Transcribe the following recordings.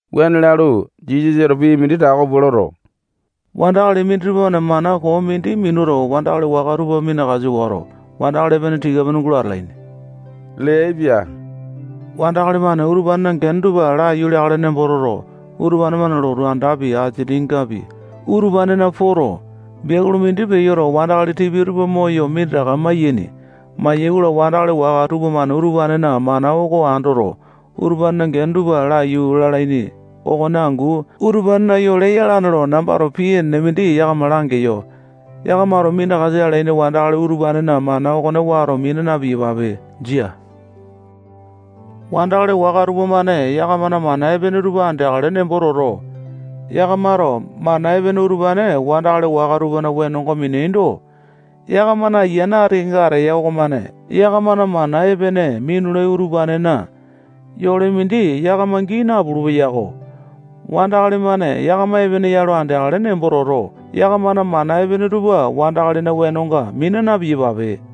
Wuane lalu, Jisasato pii mindi tako pua loto, wandakali minditupa-mane mana koo mindi minuto, wandakali waka tupa minakasa wato, wandakali epene tika-pene gulo atalaini leaipia. Wandakali-mane utupanena gene tupa laiyu leakale nembo toto, utupane-mane lotu andakapi, asiningapi, utupanena poto, biakulu mindi peyoto, wandakali tipia tupa moyo minditaka mayaini. Mayai-kola, wandakali waka tupamane utupanena mana okone andoto, utupanena gene tupa laiyu lalaini okone angu utupanena yole yalane lo, nambato pii enene mindi yakama langeyo. Yakamato minakasa alaini wandakali utupanena mana okone wato mina na-piyapape. Jia. Wandakali waka tupamane yakamana mana epene tupa andeakale nembo toto, yakamato mana epene utupane wandakali waka tupana wenonga mineaindo, yakamana ayiane ati kenga ateya okomane yakamana mana epene minulai utupanena yole mindi yakama gii napulu-peyako. Wandakali-mane yakama epene ya lo andeakale nembo toto, yakamana mana epene tupa wandakalina wenonga mina na-piyape.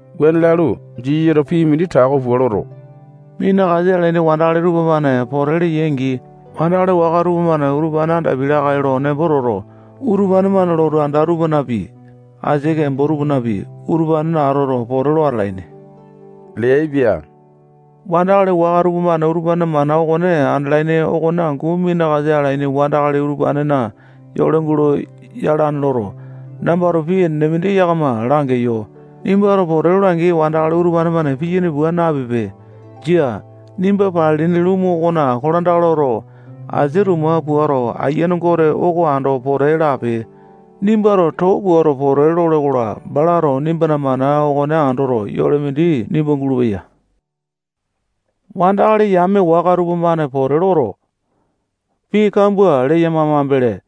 Wuane lalu, Jisasato pii mindi tako pua loto, minakasa alaini wandakali tupamane pote leyai-angi, wandakali waka tupamane utupane andapiai lakae lo nembo toto, utupane-mane lotu anda tupanapi, asia kembo tupanapi, utupanena atoto, pote lo atalaini leaipia. Wandakali waka tupamane utupanena mana okone andalaini okone angu minakasa alaini wandakali utupanena yole gulo yalane loto, nambato pii enene mindi yakama langeyo. Nimbato pote lole-angi, wandakali utupane-mane piyaini pua napipe. Jia. Nimba palilini lumu okona kolandaka loto, asia tuma puato, Ayiane Gote oko ando pote lape. Nimbato too pua pote lole-kola, balato nimbana mana okone andoto, yole mindi nimba gulupeya. Wandakali yame waka tupamane pote loto, pii kambua leyama mambele,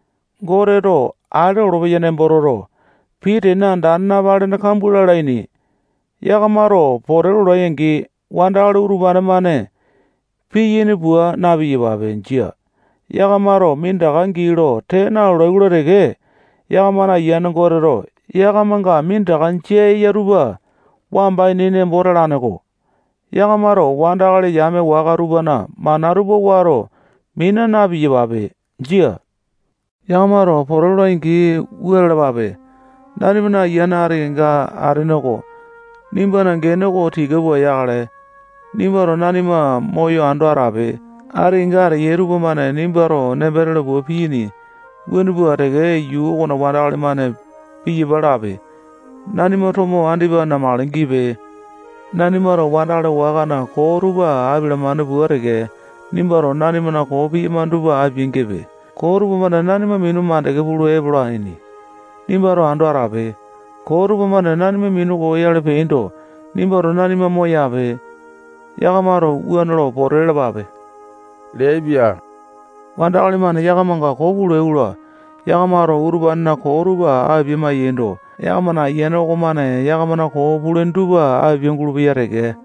Goteto ale olopeya nembo toto, pii tene andane napalene kambua lalaini. Yakamato pote lolai-angi, wandakali utupane-mane piyaini pua na-piyapape. Jia. Yakamato minditaka gii lo tee nalolai-kola teke, yakamana ayiane Goteto yakamanga minditaka jia eya tupa wamba ini nembo talane-ko. Yakamato wandakali yame waka tupana mana tupa wato mina na-piyapape. Jia. Yakamato pote lolai-angi, wua lalapape: Nanimana ayiane ati kenga atene oko, nimbana gene oko tika pua yakale. Nimbato nanima moyo ando atape. Ati kenga ateyai tupamane nimbato nembo tele pua piyaini. Wuane pua teke, yuu okona wandakali-mane piyapa lape. Nanima tomo andipa namakale gipe. Nanimato wandakali wakana koo tupa apialamane pua teke, nimbato nanimana koo piyamane tupa apia-gipe. Koo tupamane nanima minu makande pulu epolaini. Nimbato ando atape. Koo tupamane nanima minu koyoyale peaindo, nimbato nanima moyape. Yakamato wuane loto, pote lalapape leaipia. Wandakali-mane yakamanga koo pulai-kola, yakamato utupanena koo tupa apia-maiyaindo, yakamana ayiane okomane yakamana koo pulaini tupa apia-gulupeya teke.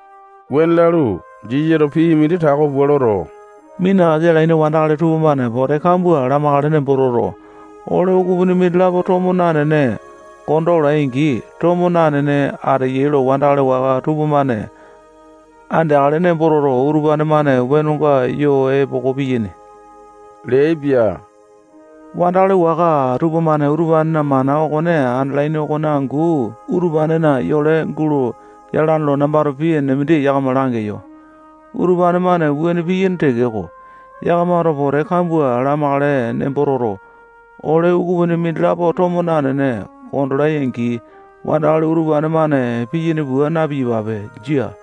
Wuane lalu, Jisasato pii mindi tako pua loto, minakasa alaini wandakali tupamane pote kambua lamakale nembo toto, ole ukupini mindilapo tomo nanene konda olai-angi, tomo nanene ateyai lo wandakali waka tupamane andeakale nembo toto, utupane-mane wenonga yo epoko piyaini leaipia. Wandakali waka tupamane utupanena mana okone andalaini okone angu utupanena yole gulo yalane lo nambato pii enene mindi yakama langeyo. Utupane-mane wuane piyaini tekeko, yakamato pote kambua lamakale nembo toto, ole ukupini mindilapo tomo nanene kondolai-angi, wandakali utupane-mane piyaini pua na-piyapape. Jia.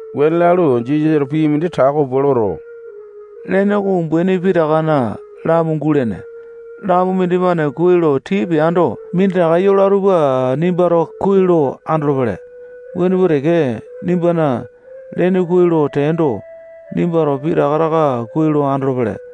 Wuane lalu, Jisasato pii mindi tako pua loto, lene oko umbaini pitakana lamu gulene. Lamu mindimane kuai lo tii peando, minditaka yola tupa nimbato kuai lo andolopele. Wuane pua teke, nimbana lene kuai lo teando, nimbato pitaka taka kuai lo andolopele.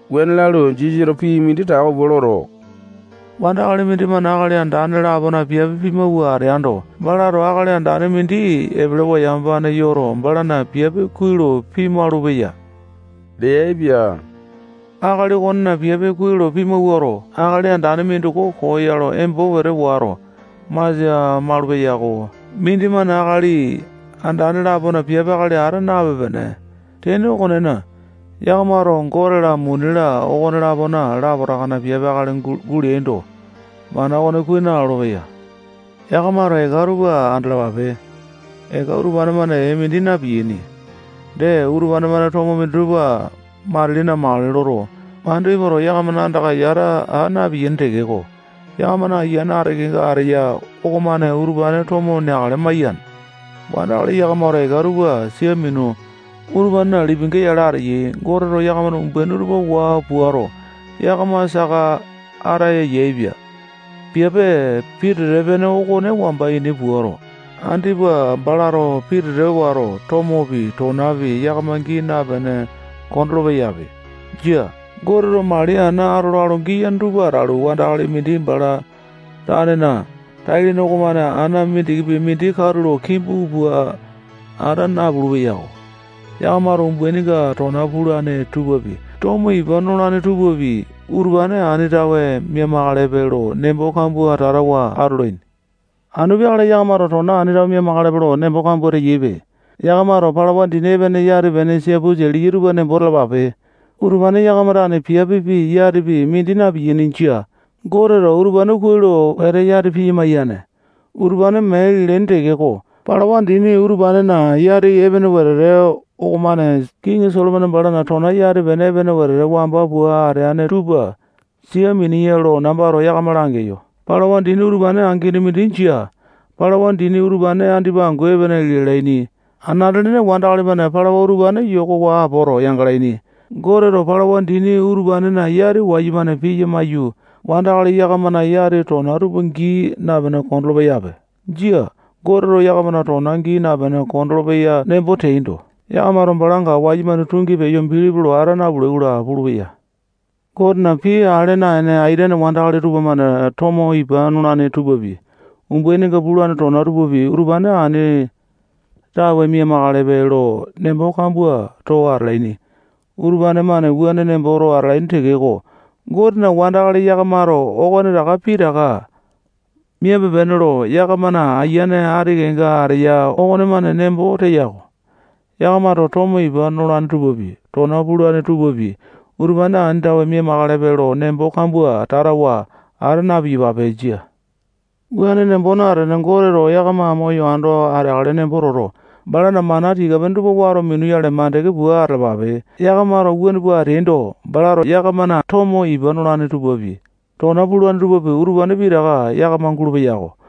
Wuane lalu, Jisasato pii mindi tako pua loto, wandakali mindimane akali andane lapona piape pimawua ateando, balato akali andane mindi epelewa yamapane yoto, balana piape kuai lo pimaulu-peya leaipia. Akali okonena piape kuai lo pimawuato, akali andane mindoko koo ya lo embo wete wato, masia malu-peyako. Mindimane akali andane lapona piape akali ata napepe-pene. Tene okonena, yakamato Gote-la, muni-la, okonelapo lapotakana piape akali guleaindo, mana okone kuai nalolo-peya. Yakamato eka tupa andalapape. Eka utupane-mane ee mindi na-piyaini. Dee, utupane-mane tomo minditupa matili namakale loto, mandu epoto, yakamana anda tupana yata aa na-piyaini tekeko, yakamana ayiane ati kenga ateya okomane utupane tomo neakale maiyane. Wandakali yakamato eka tupa sia minu, utupanena lipinga yale ateyai. Goteto yakamana umbaini oko waa puato, yakama saka ataya yaepia. Piape pitete-pene okone wamba ini puato, andipa balato pitete wato, tomopi, tonapi yakama gii napene kondolo-peyape. Jia. Goteto mali ana atola lo giyane tupa atalu, wandakali mindi bala tanena tai-lene okomane ana mindikipi mindi katulo kimbu pua ata napulu-peyako. Yakamato umbaininga tona pulane tupapi, tomo ipa nolane tupapi, utupane ani tawe mia-makalepe lo nembo kambua tatawa atolaini. Anu peakale yakamato tona ani tawe mia-makalepe lo nembo kambua teyaipe. Yakamato palawa dini epene yati-pene siapusa liya tupa nembo talapape. Utupane yakama tane piape pii, yati pii, mindi na-piyaini. Jia. Goteto utupane kuai lo wete yati piya maiyane. Utupane mee lialaini tekeko, palawa dini utupanena yati epene wetete okomane kiŋi Solomone balana tona yati-pene epene wete wamba pua ateane tupa sia miniya lo nambato yakama langeyo. Palawa dini utupane angini mindi jia. Palawa dini utupane andipa angu epene lialaini. Anate-lene wandakali-mane palawa utupane yokowa apoto, yangalaini. Goteto palawa dini utupanena yati wayumane piya maiyu, wandakali yakamana yati tona tupa gii napene kondolo-peyape. Jia. Goteto yakamana tona gii napene kondolo-peya nembo teaindo, yakamato balanga wayumane tungi peyo bilipi lo ata napulai-kola pulupeya. Gotena pii ale naene aitene wandakali tupamane tomo ipa nolane tupapi, umbaininga pulane tona tupapi, utupane ani tawe mia-makalepe lo nembo kambua too atalaini. Utupane-mane wuane nemboto atalaini tekeko, Gotena wandakali yakamato okonetaka pitaka miape-pene lo yakamana ayiane ati kenga ateya okomane nembo teya-ko. Yakamato tomo ipa nolane tupapi, tona pulane tupapi, utupane ani tawe mia-makalepe lo nembo kambua tatawa ata na-piyapape. Jia. Wuane nembo natene, Goteto yakama moyo ando ateakale nembo toto, balana mana tika-pene tupa wato minuyale mandeke pua atalapape. Yakamato wuane pua ateaindo, balato yakamana tomo ipa nolane tupapi, tona pulane tupapi, utupane pitaka yakama gulupeya.